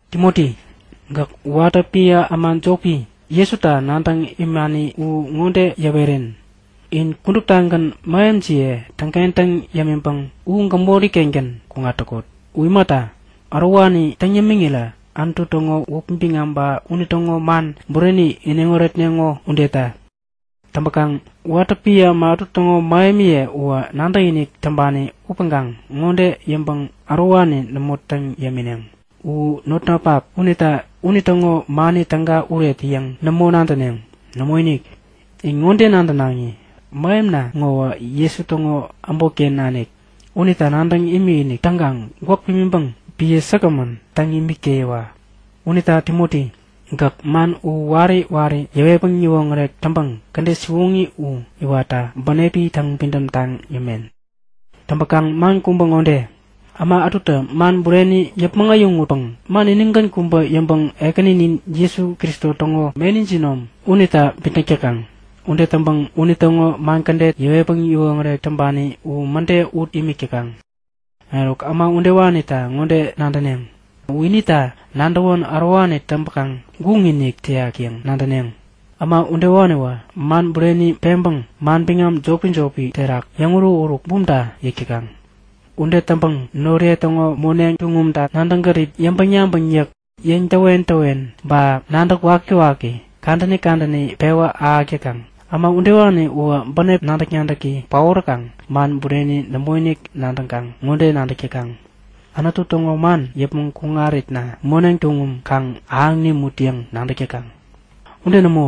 Timoti, gäk watä piä äma jopi, Jesuta nadäŋ imani u ŋode yäweren; In kuduptagän mähemjiye täŋkentäŋ yämiŋpäŋ u gämori-kengän kuŋat täkot. U imata, ärowani täŋ yämiŋirä Anutu täŋo wäpi biŋam ba unitäŋo man bureni iniŋ wärätneŋo udeta. Täŋpäkaŋ watä piä äma ätu täŋo mähemiye uwä nadäkinik täŋpani upäŋkaŋ ŋode yäŋpäŋ ärowani nämo täŋ yämineŋ; U notnapak unita unitäŋo mani täga uret yäŋ nämo nadäneŋ. Nämoinik! In ŋode nadänaŋi; Mähemna ŋowä Jesu täŋo äbotken nanik. Unita nadäŋ imikinik täŋkaŋ gwäk pimiŋpäŋ piä säkgämän täŋ imik täyiwa! Unita Timoti, gäk man u wari wari yäwetpäŋ yäwoŋärek täŋpäŋ kädet siwoŋi u iwatta bänepi täŋpidäm taŋ yämen. Täŋpäkaŋ man kubä ŋode; Äma ätutä man bureni yäpmäŋ äyäŋutpäŋ man inigän kubä yäŋpäŋ Ekäninin Jesu Kristo täŋo meni jinom unita bitnäk täkaŋ. Ude täŋpäŋ unitäŋo man kädet, yäwetpäŋ yäwoŋärek täŋpani u mäde ut imik täkaŋ. Eruk äma udewanita ŋode nadäneŋ; U inita nadäwän ärowani täŋpäkaŋ guŋinik täyak yäŋ nadäneŋ. Äma udewaniwä man bureni peŋpäŋ manbiŋam jopi-jopi terak yäŋuruk-uruk bumta yäk täkaŋ. Ude täŋpäŋ noriye täŋo moneŋ tuŋumta nadäŋ gärip, yäŋpäŋ-yabäŋ yäk, yäŋtäwen-täwen ba nadäk wakiwaki, kadäni kadäni pewä ahäk täkaŋ. Äma udewani uwä bänep nadäk-nadäki paoräkaŋ man bureni nämoinik nadäŋkaŋ ŋode nadäk täkaŋ; Anutu täŋo man yäpmäŋ kuŋaritna moneŋ tuŋum kaŋ ahäŋ nimut yäŋ nadäk täkaŋ. Ude nämo,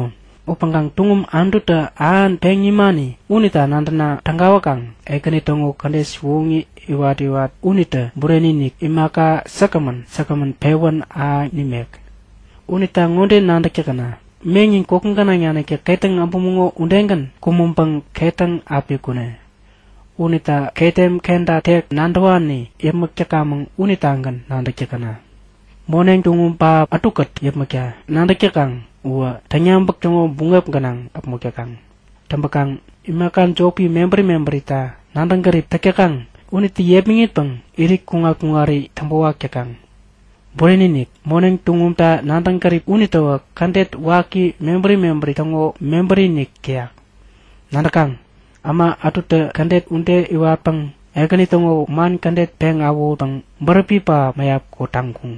upäŋkaŋ tuŋum Anututä ähan peŋ nimani unita nadäna tägawäkaŋ Ekäni täŋo kädet siwoŋi iwat-iwat unitä bureni-inik, imaka säkgämän säkgämän pewän ahäŋ nimek. Unita ŋode nadäk täkäna; Meŋnin koki gänaŋ naniktä ketäŋ äbumäŋo udegän kumäŋpäŋä ketäŋ api kune. Unita ketem kenta tek nadäwani yäpmäk täkamäŋ unitagän nadäk täkäna! Moneŋ tuŋum pähap ätukät yäpmäkta nadäk täkaŋ uwä täŋyabäk täŋo buŋep gänaŋ äpmok täkaŋ. Täŋpäkaŋ imaka jopi mebäri mebärita nadäŋ gärip täk täkaŋ unitä yepmäŋitpäŋ irit kuŋat-kuŋari täŋpänwak täkaŋ. Bureni-inik! Moneŋ tuŋumta nadäŋ gärip unitäwä kädet waki mebäri mebäri täŋo mebäri-inik täyak. Nadäkaŋ? Äma ätutä kädet ude iwatpäŋ Ekäni täŋo man kädet peŋ awähutpäŋ bäräpi pähap mäyap kotaŋkuŋ.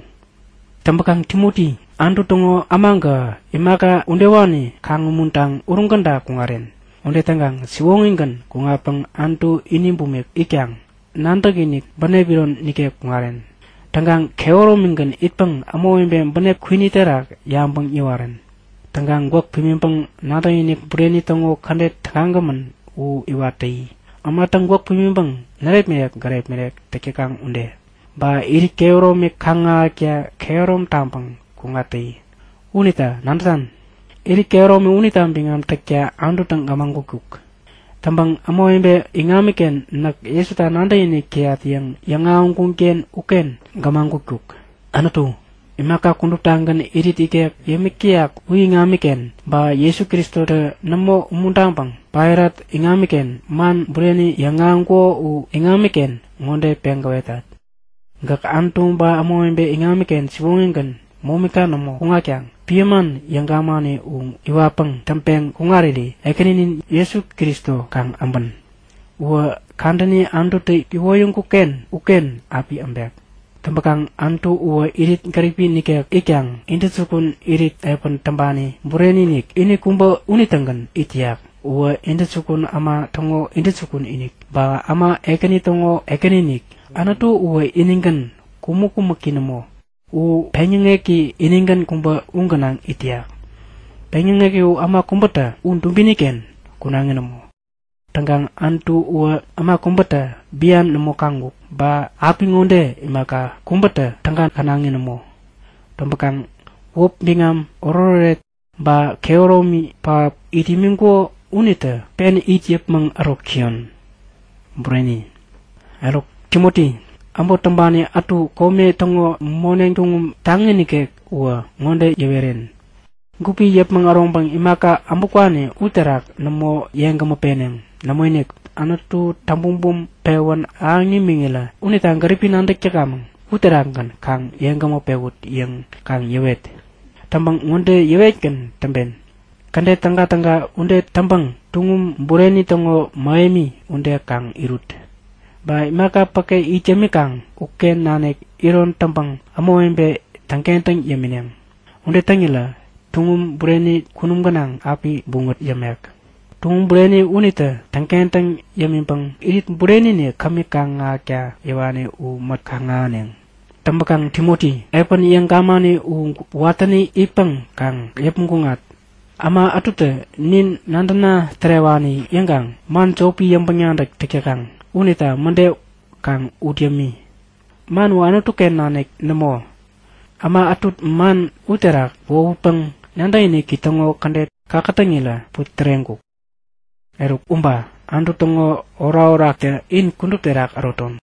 Täŋpäkaŋ Timoti, Anutu täŋo äma gähä imaka udewani kaŋ-umuntaŋ uruŋ käda kuŋaren. Ude täŋkaŋ siwoŋigän kuŋatpäŋ Anutu ini bumik itkaŋ, nadäkinik, bänep iron nikek kuŋaren. Täŋkaŋ kehäromigän itpäŋ ämawebe bänep kwini terak yabäŋ yäwaren. Täŋkaŋ gwäk pimiŋpäŋ nadäkinik bureni täŋo kädet tägagämän u iwat täyi, ämatä gwäk pimiŋpäŋ närepmirek gärepmirek täk täkaŋ ude. Ba irit kehäromi kaŋ-ahäkta kehärom taŋpäŋ kuŋat täyi. Unita nadätan? Irit kehäromi unita biŋam täkta Anututä gämagutkuk. Täŋpäŋ ämawebe iŋamiken Näk Jesuta nadäkinik täyat yäŋ yäŋahäŋkun-ken uken gämagutkuk. Anutu, imaka kuduptagän irit ikek yämik täyak u iŋamiken, ba Jesu Kristotä nämo umuntaŋpäŋ Pailat iŋamiken man bureni yäŋahäŋkuko u iŋamiken, ŋode peŋ gäwetat; Gäk Anutu ba ämawebe iŋamiken siwoŋigän, momika nämo kuŋatkaŋ piä man yäŋ gamani u iwatpäŋ täŋpeŋ kuŋariri Ekäninin Jesu Kristo kaŋ äbän. Uwä kadäni Anututä iwoyäŋkuk-ken uken api äbek. Täŋpäkaŋ Anutu uwä irit gäripi nikek itkaŋ intäjukun irit piä täŋpani bureni-inik ini kubä unitägän it täyak. Uwä intäjukun äma täŋo Intäjukun-inik, ba äma ekäni täŋo Ekäni-inik. Anutu uwä inigän, kumäk-kumäki nämo. U peŋyäŋeki inigän kubä u gänaŋ it täyak. Peŋyäŋeki u äma kubätä u dubini-ken kunaŋi nämo. Täŋkaŋ Anutu uwä äma kubätä bian nämo kaŋkuk ba apiŋode imaka kubätä täga känaŋi nämo. Täŋpäkaŋ wäpi biŋam, iniŋoret-oret ba kehäromi pähap it imiŋkuko unitä pen it yäpmäŋ ärok täyon. Bureni! Eruk Timoti, äbot täŋpani ätu kome täŋo moneŋ tuŋum taŋi nikek uwä ŋode yäweren; Gupi yäpmäŋ äroŋpäŋ imaka äbutkwani uterak nämo yeŋgämä peneŋ. Nämoinik, Anutu, täŋbumbum pewän ahäŋ nimiŋirä unita gäripi nadäk täkamäŋ uterakgän kaŋ yeŋgämä pewut yäŋ kaŋ yäwet. Täŋpäŋ ŋode yäwetgän täŋpen; Kädet tägatäga ude täŋpäŋ tuŋum bureni täŋo mähemi ude kaŋ irut. Ba imaka päke it yämikaŋ uken nanik iron täŋpäŋ ämawebe täŋkentäŋ yämineŋ. Ude täŋirä tuŋum bureni kunum gänaŋ api buŋät yämek. Tuŋum bureni unitä täŋkentäŋ yämiŋpäŋ Irit bureni-inik kämi kaŋ-ahäkta yäwani u mät kaŋ-ahäneŋ. Täŋpäkaŋ Timoti, piä yäŋ gamani u watäni itpäŋ kaŋ yäpmäŋ kuŋat. Äma ätutä Nin nadäna-tärewani yäŋkaŋ man jopi yäŋpäŋ-nadäk täk täkaŋ, unita mäde kaŋ ut yämi. Man u Anutu-ken nanik nämo. Äma ätu man uterak wohutpäŋ nadäkiniki täŋo kädet kakätäŋirä putäreŋkuk. Eruk uba. Anutu täŋo orakoraktä in kudup terak äroton.